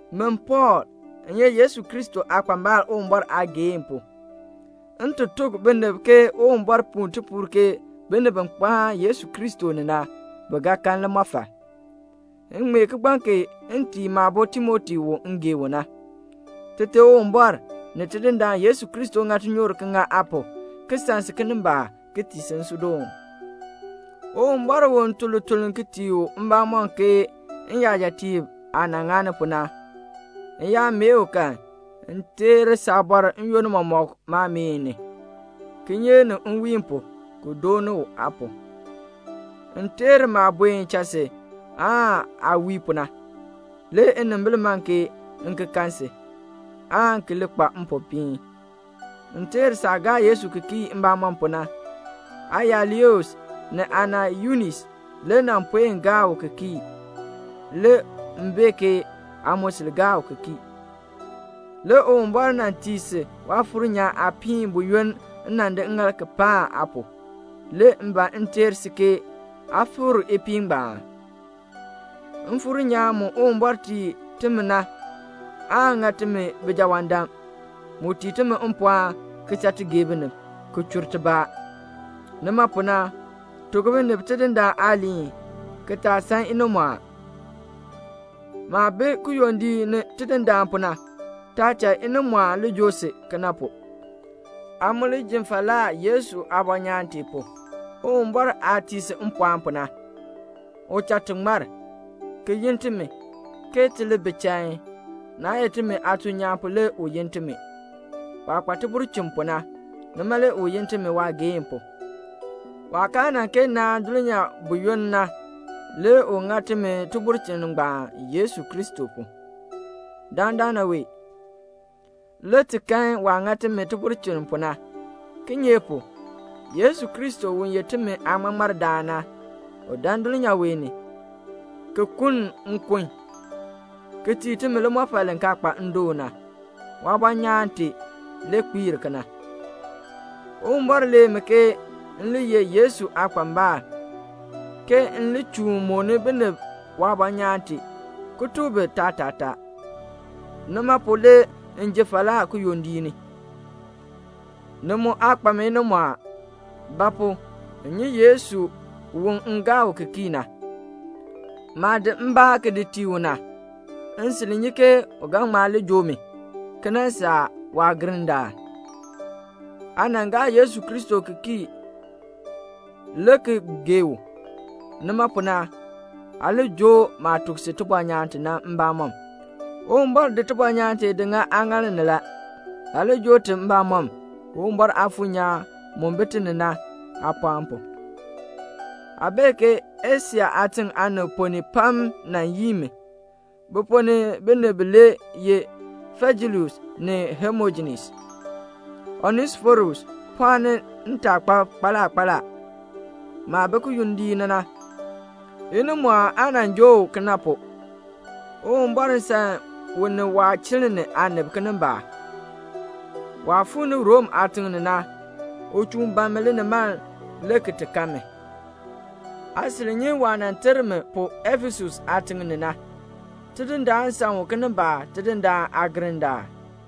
Min Pɔɔl, m ye Yesu Kristo aakpambal Uwumbɔr aageehn pu, m ti tuk binib ke Uwumbɔr puu tipuul ke binib bi kpaan Yesu Kristo ni na, bi ga kan limɔfal. M ŋmee kigbaŋ kee m tii maabo Timoti u m gee u na. Tite Uwumbɔr ni Tidindaan Yesu Kristo ŋa tinyoor ki ŋa aa pu, ki san si kinimbaak, ki tii si nsuudoon. Uwumbɔr u m tun lituln tii u mbamɔm ke n-yajatiib aah nan ŋani pu na, m yaa mee u kan, m teer saabɔr n-yoonn mɔmɔk maameen ni, kinyeek ni nwiin pu, ki dooni u aa pu. M teer maah buen cha si aa wii pu na. Le nnimbil man ke m ki kan si, aan ki li kpa mpopiin. M teer saah gaa Yesu ki kii mbamɔm pu na. Aaya Lois ni aana Yunis le nan puen gaa u ki kii. Le m bee ke aa mu sil gaa u ki kii. Le Uwumbɔr nan tii si Waafuur nyaan aapiin buyoonn m nan di ŋŋaal ki paan aa pu; le m ban m teer si aa fikr ipiin ngbaan. Mfuur nyaan mu Uwumbɔr tii timi na aan ŋa timi bijawaandam. Mu tii timi mpɔɔn, ki cha ti gee binib, ki li chur tibaa. Nima pu na, tuk binib Tidindaan aaliin, ki taa san inimɔɔn. Maah bi kiyondiik ni Tidindaan pu na, taa cha inimɔɔn li joo si kena pu. Aa mu li ji falaa Yesu aabɔnyaan tee pu, Uwumbɔr aah tii si mpɔɔn pu na. U cha ti ŋmar, ki yin timi, ke ti li bi chain. Naa ye timi aatuln nyaan pu le u yin timi. Waah kpa tibulchin pu na, nima le u yin timi waageehn pu. Waah kaa nan kee naan dulnyaa buyoonn na le u ŋa timi tibulchin ngbaan Yesu Kristo pu. Dandana wee, le ti kan waah ŋa timi tibulchin pu na; kinye pu? Yesu Kristo, u ye timi aaŋmaŋmardaan na, u dan dulnyaa wee ni, ki kuln nkun, ki tii timi limɔfal li kaa kpa ndoon na. Waabɔnyaan tee le kpiir kena. Uwumbɔr lee mi ke m le ye Yesu aakpambal, ke m li chuun mooni binib waabɔnyaan tee, ki tuk bi taatataa. Nima pu le m ji falaa kiyondiik ni. Ni mu aa kpa mi inimɔɔn. Ba pu? m nyi Yesu u m gaa u ki kii na. Maah di mbaa ki di tii u na, m sil nyi ke u ga ŋma li joo mi, ki nan saa waagirndaal. Aa nan gaa Yesu Kristo ki kii le ki gee u; nima pu na, aa li joo maah tuk si tibɔnyaan ti na mbamɔm. Uwumbɔr di tibɔnyaan tee di ŋa aaŋaal ni la; aa li joo ti mbamɔm, Uwumbɔr Aafuur nyaan mu bi ti ni na aapɔɔn pu. Aa bee ke Asia aatiŋ aanib ponn ni pam nan yii mi. Bi ponn ni binib bilee ye Fijelus ni Hemojenes. Onesiforus pɔɔni ntaakpab kpaala kpaala. Maah bi kiyondiik ni na, inimɔɔn aa nan joo u kena pu. Uwumbɔr san u ni waachiln ni aanib kinimbaak. Waah fuu ni Rom aatiŋ ni na, u chuun ban mi linimaln le ki ti kan mi. Aa sil nyi waah nan ter mi pu Efesus aatiŋ ni na. Tidindaan san u kinimbaak Tidindaan aagirndaal.